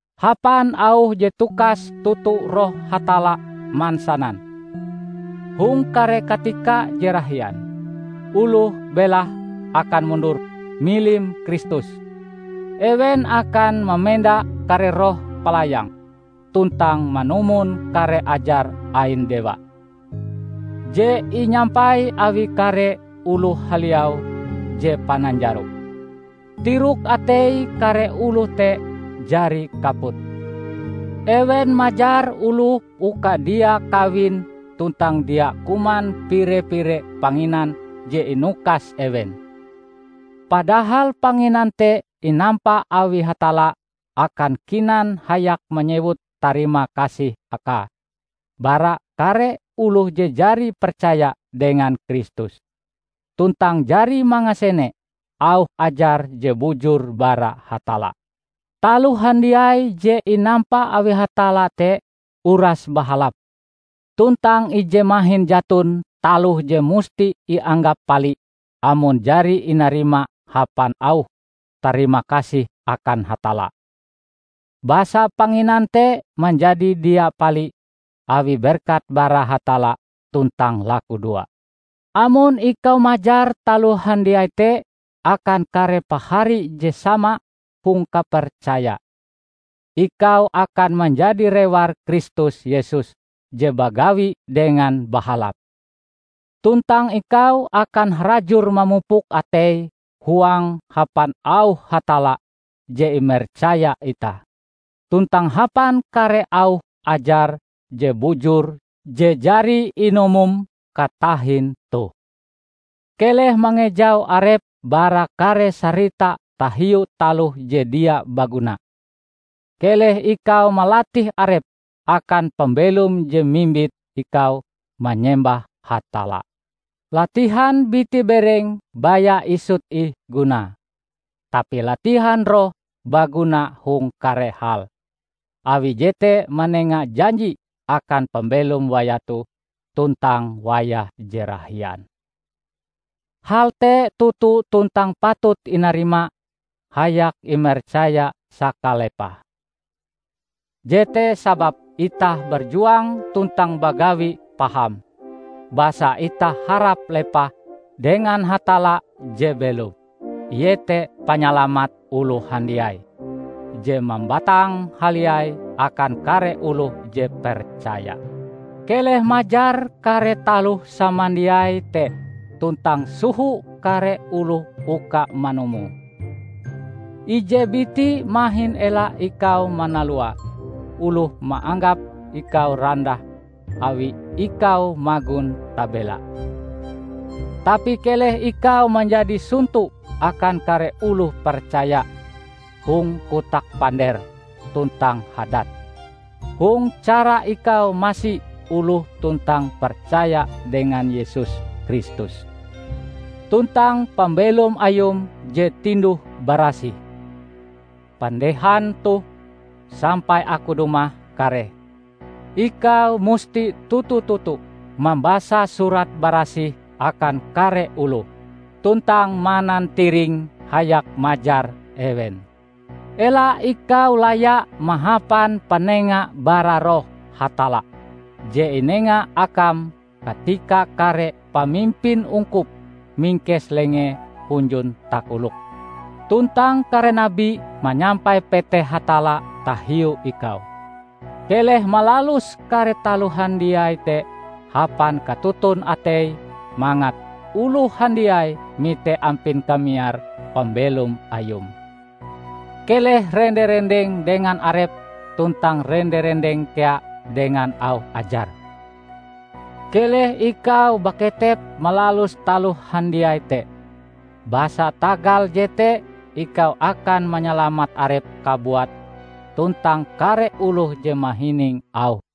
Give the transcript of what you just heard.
Hapan auh je tukas toto Roh Hatalla mansanan: hong kare katika je rahian, oloh belahe akan mundur, milim Kristus. Ewen akan mamenda kare roh palayang tuntang manumon kare ajar ain dewa, je inyampai awi kare oloh haliau je pananjaro. Tirok atei kare oloh te jari kaput. Ewen majar oloh uka dia kawin tuntang dia kuman pire-pire panginan je inukas ewen. Padahal panginan te inampa awi Hatalla akan kinan hayak manyewut tarimakasih Akae bara kare oloh je jari percaya dengan Kristus tuntang jari mangasene auh ajar je bujur bara Hatalla. Taloh handiai je inampa awi Hatalla te uras bahalap, tuntang ije mahin jaton taloh je musti ianggap pali amon jari inarima hapan auh tarimakasih akan Hatalla. Basa panginan te manjadi dia pali awi berkat bara Hatalla tuntang lakudoa. Amon ikau majar taloh handiai te akan kare pahari je sama hong kapercaya, ikau akan manjadi rewar Kristus Yesus je bagawi dengan bahalap. Tuntang ikau akan harajur mamupuk atei huangm hapan auh Hatalla je imercaya itah, tuntang hapan kare auh ajar je bujur je jari inumom katahin toh. Keleh mangejau arepm bara kare sarita tahiu taloh je dia baguna. Keleh ikau malatih arepm akan pambelom je mimbit ikau manyembah Hatalla. Latihan biti-bereng baya isut ih gunae, tapi latihan roh baguna hong kare hal, awi jete manenga janji akan pambelom wayah toh tuntang wayah je rahian. Hal te toto tuntang patut inarima hayak imercaya sakalepahe. Jete sababe itah berjuang tuntang bagawi paham, basa itah harap lepah dengan Hatalla je belom; iete panyalamat oloh handiai, je mambatang haliai akan kare oloh je percaya. Keleh majar kare taloh samandiai te tuntang soho kare oloh uka manumoe. Ije biti mahin ela ikau manalua oloh maanggap ikau randah awi ikau magon tabela. Tapi keleh ikau manjadi sonto akan kare oloh percaya hong kotak panderm tuntang hadatm, hong cara ikau masi oloh tuntang percaya dengan Yesus Kristus, tuntang pambelom ayum je tinduh-barasih. Pandehan toh, sampai aku dumah kareh, ikau musti toto-toto mambasa Surat Barasih akan kare oloh, tuntang manantiring hayak majar ewen. Ela ikau laya mahapan panenga bara Roh Hatalla je inenga akam katika kare pamimpin ungkup mingkes lengee hunjun takolokm, tuntang kare nabi manyampai peteh Hatalla tahiu ikau. Keleh malalus kare taloh handiai te hapan katoton atei mangat oloh handiai mite ampin kamiar pambelom ayum. Keleh rende-rendeng dengan arepm tuntang rende-rendeng kea dengan auh ajarm. Keleh ikau baketep malalus taloh handiai te, basa tagal jete ikau akan manyalamat arepm kabuat tuntang kare oloh je mahining auhm.